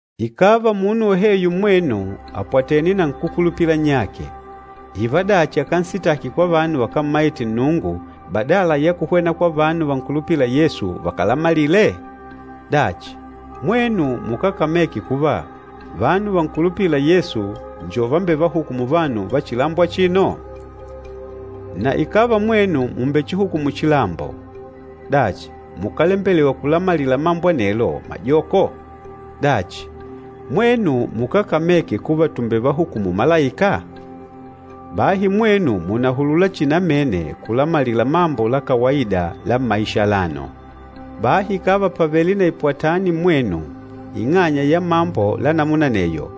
Ikàva munu woheyo mmwenu àpwatene na nkúkulupila nnyake, ìvadachi akansitaki kwa vanu vakámmaite Nnungu badala ya kuhwena kwa vanu vankulupîla Yesu vakalamalile? Dachi, mwenu mukákameke kuva vanu vankulupîla Yesu njo vambevahukûmu vanu va chilambo achino? Na ikàva mwenu mùmbechihukumu chilambo, dachi, mukálembelewa kulamalila mambo anelo majoko? Dachi, mwenu mukákameke kuva tùmbevahukumu malaika? Bahi mwenu mùnahulula chihi namene kulamalila mambo la kawaida la mmaisha alano. Bahi ikàva pàvele na ipwatani mmwenu ing'anya ya mambo la namuna aneyo,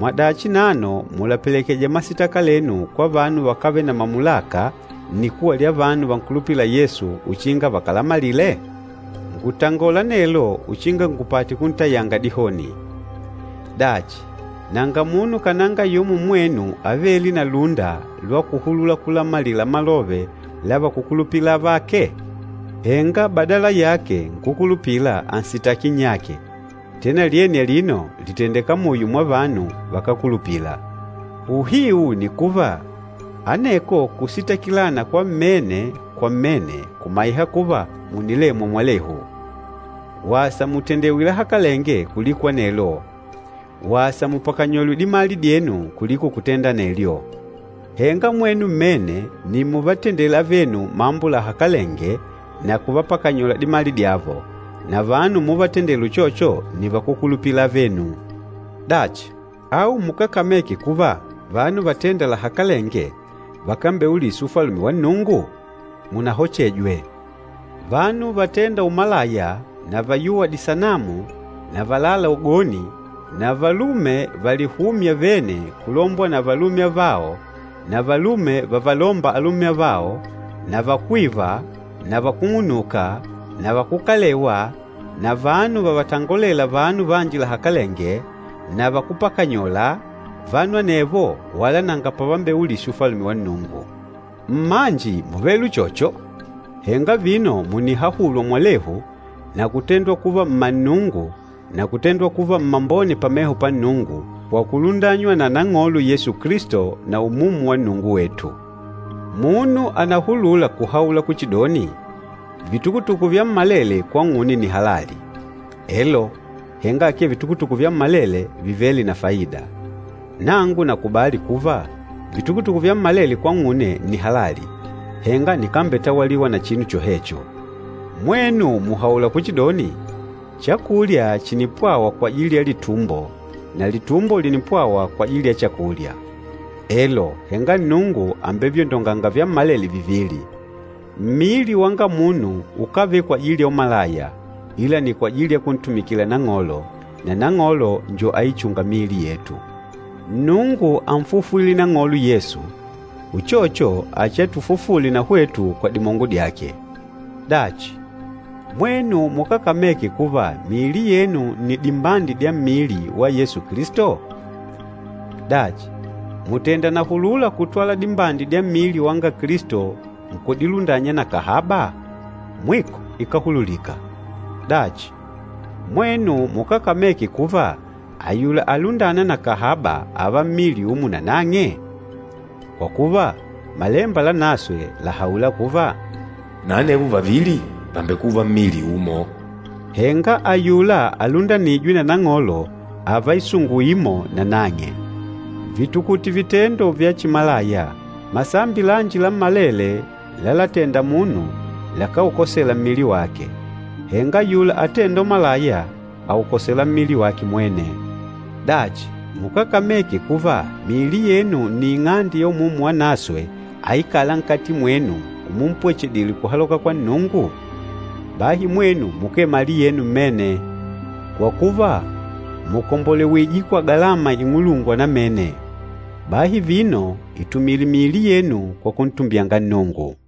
mwadachi nano mùlapelekeja masitaka lenu kwa vanu vakávele na mamulaka nnikuwa lya vanu vankulupîla Yesu uchinga vakalamalile? Ngùlatangola anelo uchinga ngupate kuntayanga dihoni. Dachi, nanga munu kananga yumo mmwenu avêle na lúnda lwa kuhulula kulamalila malove la vakúkulupila avake? Henga badala yake nkúkulupila ànsitaki nnyake, tena lyene alino lìtendeka muyo mwa vanu vakákulupila! Uhiu ni kuva, aneko kusitakilana kwa mmene kwa mmene kùmaiha kuva mùnilemwa mwalehu! Wasa mutendewe lahakalenge kuliko anelo! Wasa mupakanyolwe dimali dyenu kuliko kutenda anelyo! Henga mwenu mmene nni muvatendêla avenu mambo lahakalenge na kuvapakanyola dimali dyavo, na vanu umuvatendela uchocho nni vakúlupila avenu! Dachi, au mukákameke kuva vanu vatênda lahakalenge vakambeulisi ufalume wa Nnungu? Munahochejwe! Vanu vatênda umalaya na vayûwa disanamu na valâla ugoni, na valume valihûmya vene kulombwa na valume avao na valume vavalômba valume avao, na vakwîva, na vakúng'unuka, na vakukalewa, na vanu vavatongolêla vanu vanji lahakalenge, na vakúpakanyola, vanu anevo wala nanga pavambeulisi Ufalume wa Nnungu. Mmanji múvele uchocho, henga vino mùnihahulwa mwalehu na kutendwa kuva mma Nnungu na kutendwa kuva mmambone pameho pa Nnungu kwa kulundanywa na Nang'olo Yesu Kilisto na Umumu wa Nnungu wetu. Munu ànahulula kuhaula kuchidoni, “Vitukutuku vyammalele kwang'une nni halali.” Elo, henga akee vitukutuku vyammalele vivêle na faida. Nangu nàkubali kuva, “Vitukutuku vyammalele kwang'une nni halali,” henga nikambetawaliwa na chinu chohecho. Mwenu muhaula kuchidoni, “Chakulya chìnipwawa kwajili ya litumbo na litumbo lìnipwawa kwajili ya chakulya.” Elo, henga Nnungu àmbevyondonganga vyammalele vivili. Mmili wanga munu ukávele kwajili ya umalaya, ila ni kwajili ya kuntumikila Nang'olo, na Nang'olo njo aichûnga miili yetu. Nnungu ánfufwile Nang'olo Yesu, uchocho achiatufufule na hwetu kwa dimongo dyake. Dachi, mwenu mukákameke kuva miili yenu nni dimbandi dya mmili wa Yesu Kilisto? Dachi, mùtenda nahulula kutwala dimbandi dya mmili wanga Kilisto nkudilundanya na kahaba? Mwiko ikáhululika! Dachi, mwenu mukákameke kuva ayula alundâna na kahaba ààva mmili umo na nang'e? Kwa kuva, Malemba Lanaswe làhaula kuva, “Na anevo vavili vàmbekuva mmili umo.” Henga ayula alundanîjwe na Nang'olo ààva isungu imo na nang'e. Vitukute vitendo vya chimalaya! Masambi lanji lammalele lalatenda munu lakáukosela mmili wake, henga ayula atênda umalaya, àukosela mmili wake mwene. Dachi, mukákameke kuva miili yenu nni ing'ande ya Umumu Wanaswe aikâla nkati mwenu umumpwechedile kuhaloka kwa Nnungu? Bahi mwenu mukee mali yenu mmene. Kwa kuva, mùkombolewije kwa galama ing'ulungwa namene. Bahi vino, itumile miili yenu kwa kuntumbyanga Nnungu.